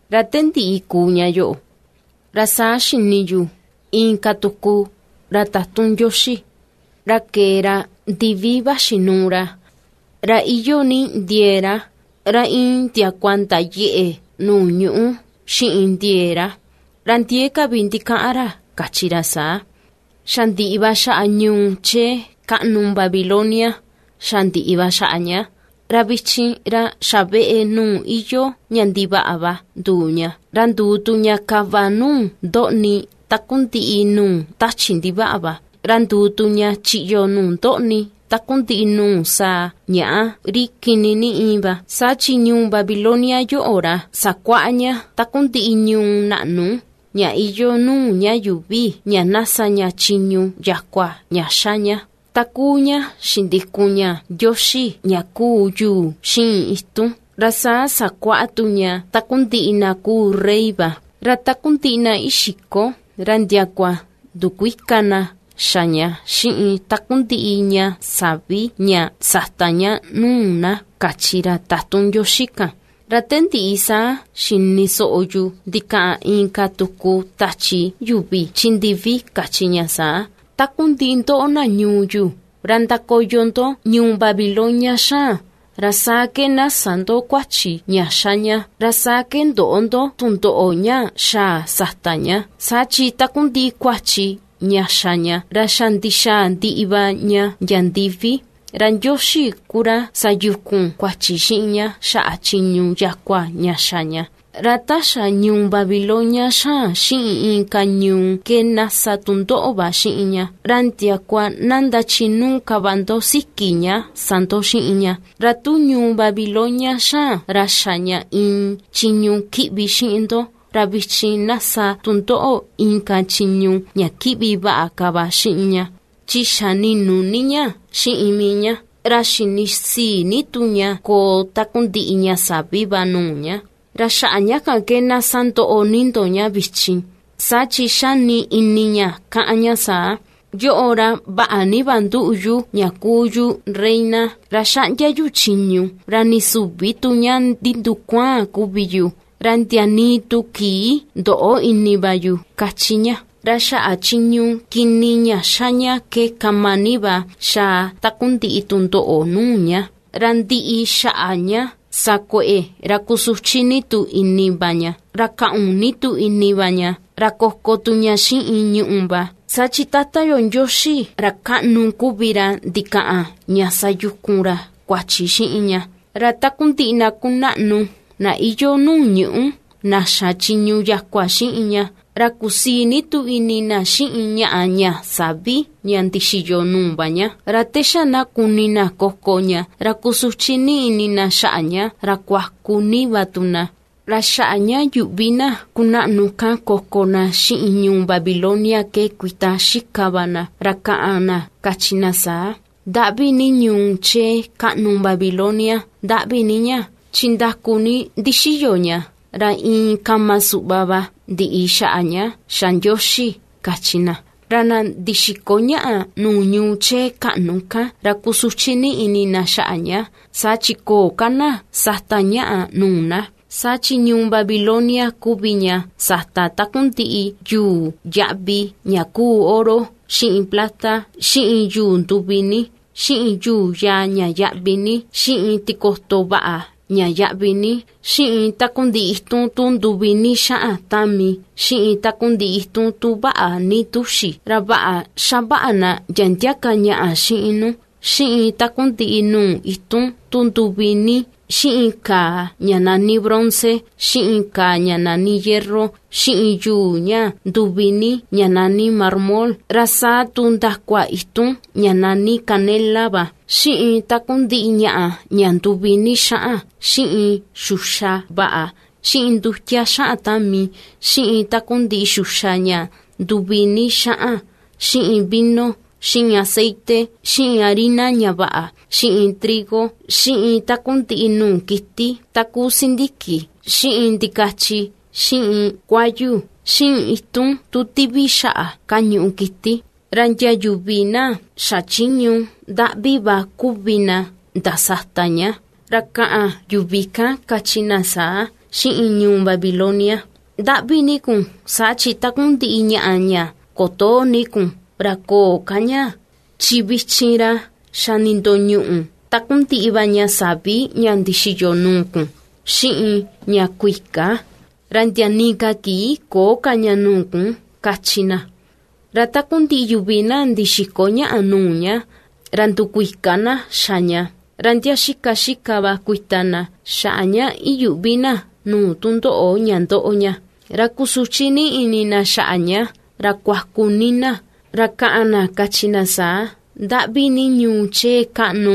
Ra te ndiꞌi kuu ña yoꞌo, ra saa xini yu inka tuku ra tatun Ndioxi, ra kee ra ndivi vaxi nuu ra, ra iyoo ni ndiee ra, ra iin ndiakua ndayeꞌe nuu ñuꞌú xiꞌin ndiee ra. Ra ndiee ka vi ndikaꞌan ra kachi ra saa: ―Xa ndiꞌi va xaꞌa ñuu chee kaꞌnu Babilonia, xa ndiꞌi va xaꞌa ña; ra vichin ra xa veꞌe nuu iyoo ña ndivaꞌa va nduu ña, ra nduu tu ña kava nuu ndoꞌni takundiꞌi nuu tachi ndivaꞌa va, ra nduu tu ña chiꞌyo nuu ndoꞌni takundiꞌi nuu saa ñàꞌa, ri kini ni íin va. Saa chi ñuu Babilonia yoꞌo, ra sakuaꞌa ña takundiꞌi ñuu naꞌnu, ña iyoo nuu ña yuuvi ña sa ña chiñu yakua ña xa ña, takuu ña xindikun ña ndioxi ña kuu yuu xiꞌin itun; ra saa sakuaꞌa tu ña takundiꞌi na rey va; ra takundiꞌi na ixiko ra ndiakua ndukuika na xa ña xiꞌin takundiꞌi ña sa̱ví ña sata ña nuu na ―kachi ra tatun Ndioxi kan. Ra te ndiꞌi, saa xini soꞌo yu ndikaꞌan inka tuku tachi yuvi chi ndivi, kachi ña saa: ―Takundiꞌi ndoꞌo, na ñuu yu, ra ndakoyo ndo ñuu Babilonia xaan, ra saa ke na sä ndo kuachi ña ^xa ña; ra saa ke ndöꞌo ndo tundoꞌo ña xaa sata ña. Saa chi takundiꞌi kuachi ña xa ña, ra xa ndixaa ndiꞌi va ña ndia ndivi, ra Ndioxi ku ra sayukun kuachi xiꞌin ña xaꞌa chiñu yakua ña xa ña. Ra ta xa ñuu Babilonia xaan xiꞌin inka ñuu ke na sa tu ndoꞌo va xiꞌin ña; ra ndiakua na ndachinuu ka va ndo siki ña sa ndo xiꞌin ña; ra tu ñuu Babilonia xaan ra xa ña iin chiñu kiꞌvi xiꞌin ndo, ra vichin na sa tu ndoꞌo inka chiñu ña kiꞌvi vaꞌa ka va xiꞌin ña, chi xa ni̱nù ni ña xiꞌin mii ña, ra xini sii ni tu ña koo takundiꞌi ña sa̱ví va nuu ña. ¡Ra xaꞌa ña kan ke na sandoꞌo ni ndo ña vichin! Saa chi ^xani ini ña kaꞌan ña saa: “Yoꞌo, ra vaꞌa ni va ^nduꞌu yu ña kuu yu reina, ra ^xaꞌndia yu chiñu ra nii süvi tu ña ndindukuaan kuvi yu, ra ndia nii tu kii ndöꞌo ini va yu”, ^kachi ña. Ra xaꞌa chiñu kini ña ^xa ña ke kama ni va xaa takundiꞌi tundoꞌo nuu ña: ra ndiꞌi xaꞌa ña sa kueꞌe, ra kusuchi ni tu ini va ña, ra kaꞌun ni tu ini va ña, ra koko tu ña xiꞌin ñùꞌù va, saa chi Tata yo Ndioxi, Ra Kaꞌnu kuvi ra ndikaꞌan ña sayukun ra kuachi xiꞌin ña ―kachi ña. Ra takundiꞌi na kunaꞌnu, na iyoo nuu ñuꞌú, na xa chiñu yakua xiꞌin ña, ra kusii ni tu ini na xiꞌin ñaꞌa ña sa̱ví ña ndixiyo nuu va ña, ra te xa na kuni na koko ña ra kusuchi ni ini na xaꞌa ña ra kuaku ni va tu na. Ra xaꞌa ña yuꞌvi na kunaꞌnu kan koko na xiꞌin ñuu Babilonia ke kuita xika va na, ra kaꞌan na kachi na saa: ―¡Ndaꞌvi ni ñuu chee kaꞌnu Babilonia, ndaꞌvi ni ña! Chi ndaku ni ndixiyo ña, ra iin kama suꞌva va ndiꞌi xaꞌa ña xa Ndioxi ―kachi na. Ra na ndixiko ñàꞌà nuu ñuu chee kaꞌnu kan ra kusuchi ni ini na xaꞌa ña, saa chi köo ka na sata ñàꞌà nuu na. Saa chi ñuu Babilonia kuvi ña sata takundiꞌi yuu yaꞌvi ña kuu oro, xiꞌin plata, xiꞌin yuu nduvi ni, xiꞌin yuu yaa ña yaꞌvi ni, xiꞌin tikoto vaꞌa ña yaꞌvi ni, xiꞌin takundiꞌi itun tu nduvi ni xaꞌan tami, xiꞌin takundiꞌi itun tu vaꞌa ni túxi, ra vaꞌa xavaꞌa na ndia ndia ka ñàꞌà xiꞌin nu, xiꞌin takundiꞌi nuu itun tu nduvi ni, xiꞌin kaa ña nani bronce, xiꞌin kaa ña nani hierro, xiꞌin yuu ña nduvi ni ña nani marmol, ra saa tu ndakua itun ña nani canela va, xiꞌin takundiꞌi ñaꞌa ña nduvi ni xaꞌan, xiꞌin xuxa vaꞌa, xiꞌin ndutia xaꞌan tami, xiꞌin takundiꞌi xuxa ña nduvi ni xaꞌan, xiꞌin vino, xiꞌin aceite, xiꞌin harina ña vaꞌa, xiꞌin trigo, xiꞌin takundiꞌi nuu kiti, takuu sindiki, xiꞌin ndikachi, xiꞌin kuayu, xiꞌin itun tu tivi xaꞌa kañuꞌu kiti, ra ndia yuvi na xachiñu ndaꞌvi va kuvi na ndasata ña. Ra ka̱ꞌa̱n yuvi kan kachi na saa xiꞌin ñuu Babilonia: ―Ndaꞌvi ni kun saa chi takundiꞌi ñàꞌà ña kutoo ni kun, ra köo ka ña; chi vichin ra xa nindoñuꞌu takundiꞌi va ña sa̱ví ña ndixiyo nuu kun, xiꞌin ña kuika; ra ndia nii ka kii köo ka ña nuu kun ―kachi na. Ra takundiꞌi yuvi na ndixiko ñaꞌa nuu ña, ra ndukuika na xa ña, ra ndia xika xika va kuita na, xaꞌa ña iyuꞌvi na nuu tundoꞌo ña ^ndoꞌo ña. Ra kusuchi ni ini na xaꞌa ña ra kuaku ni na. Ra ka̱ꞌa̱n na kachi na saa: ―Ndaꞌvi ni ñuu chee kaꞌnu,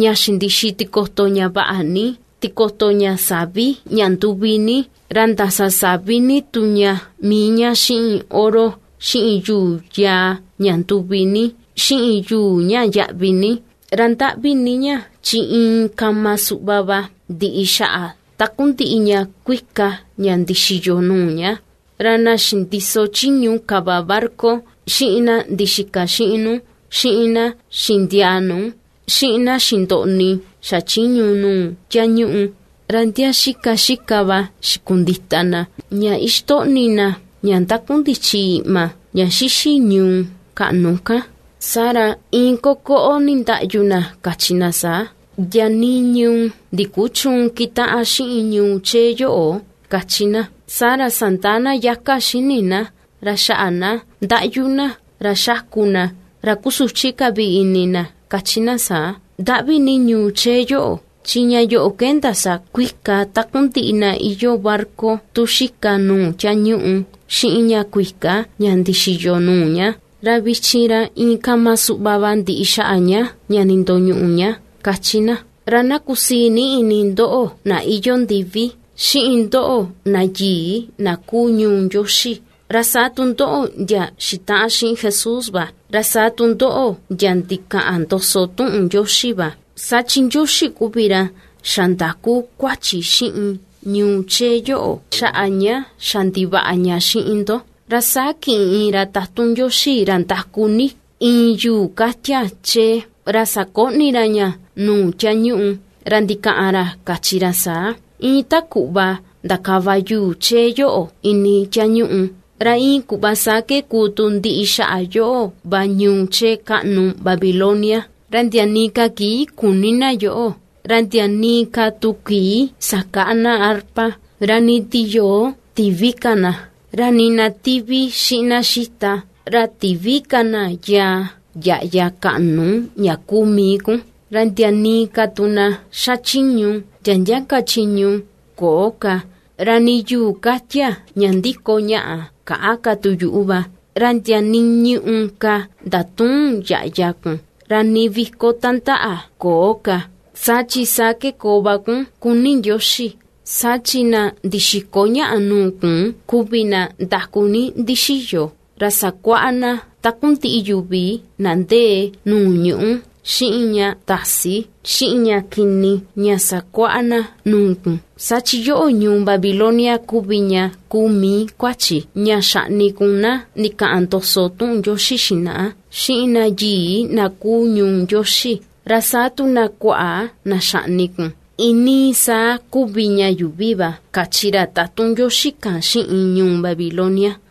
ña xindixi tikoto ña vaꞌa ni, tikoto ña sa̱ví ña nduvi ni, ra ndasasavi ni tu ña mii ña xiꞌin oro, xiꞌin yuu yaa ña nduvi ni xiꞌin yuu ña yaꞌvi ni. Ra ndaꞌvi ni ña chi iin kama suꞌva va ndiꞌi xaꞌa takundiꞌi ña kuika ña ndixiyo nuu ña ―kachi na. Ra na xindiso chiñu kava barca, xiꞌin na ndixika xiꞌin nu, xiꞌin na xindiaa nu, xiꞌin na xindoꞌni xachiñu nuu tiañuꞌu, ra ndia xika xika va xikundita na, ña ixtoꞌni na ña ndakundichi iꞌma ña xixi ñuu kaꞌnu kan, saa ra iin kokoꞌo nindaꞌyu na kachi na saa: ―Ndia nii ñuu ndikuchüun kitaꞌan xiꞌin ñuu chee yoꞌo ―^kachi na. Saa ra sandaa na yaka xini na, ra xaꞌa na ndaꞌyu na, ra xaku na, ra kusuchi ka vi ini na kachi na saa: ―Ndaꞌvi ni ñuu chee yoꞌo, chi ña yoꞌo ke ndasakuika takundiꞌi na iyoo barca tu xika nuu tiañuꞌu xiꞌin ña kuika ña ndixiyo nuu ña, ra vichin ra iin kama suꞌva va ndiꞌi xaꞌa ña nindoñuꞌu ña ―^kachi na. Ra na kusii ni ini ndoꞌo na iyoo ndivi, xiꞌin ndoꞌo na yii na kuu ñuu Ndioxi, ra saa tu ndoꞌo ndia xitaꞌan xiꞌin Jesús va, ra saa tu ndoꞌo ndia ndikaꞌan ndoso tuꞌun Ndioxi va, saa chi Ndioxi kuvi ra xandaku kuachi xiꞌin ñuu chee yoꞌo xaꞌa ña xa ndivaꞌa ni ña xiꞌin ndo. Ra saa kiꞌin iin ra tatun Ndioxi, ra ndaku ni, iin yuu katia chee, ra sakoꞌni ra ña nuu tiañuꞌu, ra ndikaꞌan ra kachi ra saa: ―Iin ta kuꞌva ndakava yuu chee yoꞌo ini tiañuꞌu, ra iin kuꞌva saa ke kuu tu ndiꞌi xaꞌa yoꞌo va ñuu chee kaꞌnu Babilonia, ra ndia nii ka kii küni na yoꞌo. Ra ndia nii ka tu kii sakäꞌa na arpa, ra nii tiyoo tïvi ka na, ra nii na tivi xiꞌin na xita, ra tïvi ka na yaa yaꞌya kaꞌnu ña kuu mii kun, ra ndia nii ka tu na xachiñu ndia ndia ka chiñu, köo ka, ra nii yuu ka̱tia̱ ña ndiko ñaꞌa käꞌa ka tu yuꞌu va. Ra ndia nii ñùꞌù ka ndatüun yaꞌya kun, ra nii viko tandaꞌa köo ka. Saa chi saa ke koo va kun kuni Ndioxi, saa chi na ndixiko ñaꞌa nuu kun kuvi na ndaku ni ndixiyo, ra sakuaꞌa na takundiꞌiꞌ yuvi na ndee nuu ñuꞌú xiꞌin ña tasi, xiꞌin ña kini, ña sakuaꞌa na nuu kun. Saa chi yoꞌo ñuu Babilonia kuvi ña kuu mii kuachi ña xaꞌni kun na ndikaꞌan ndoso tuꞌun Ndioxi xinaꞌa, xiꞌin na yii na kuu ñuu Ndioxi, ra saa tu na kuaꞌa na xaꞌni kun, iinii saa kuvi ña yuuvi va ―kachi ra tatun Ndioxi kan xiꞌin ñuu Babilonia.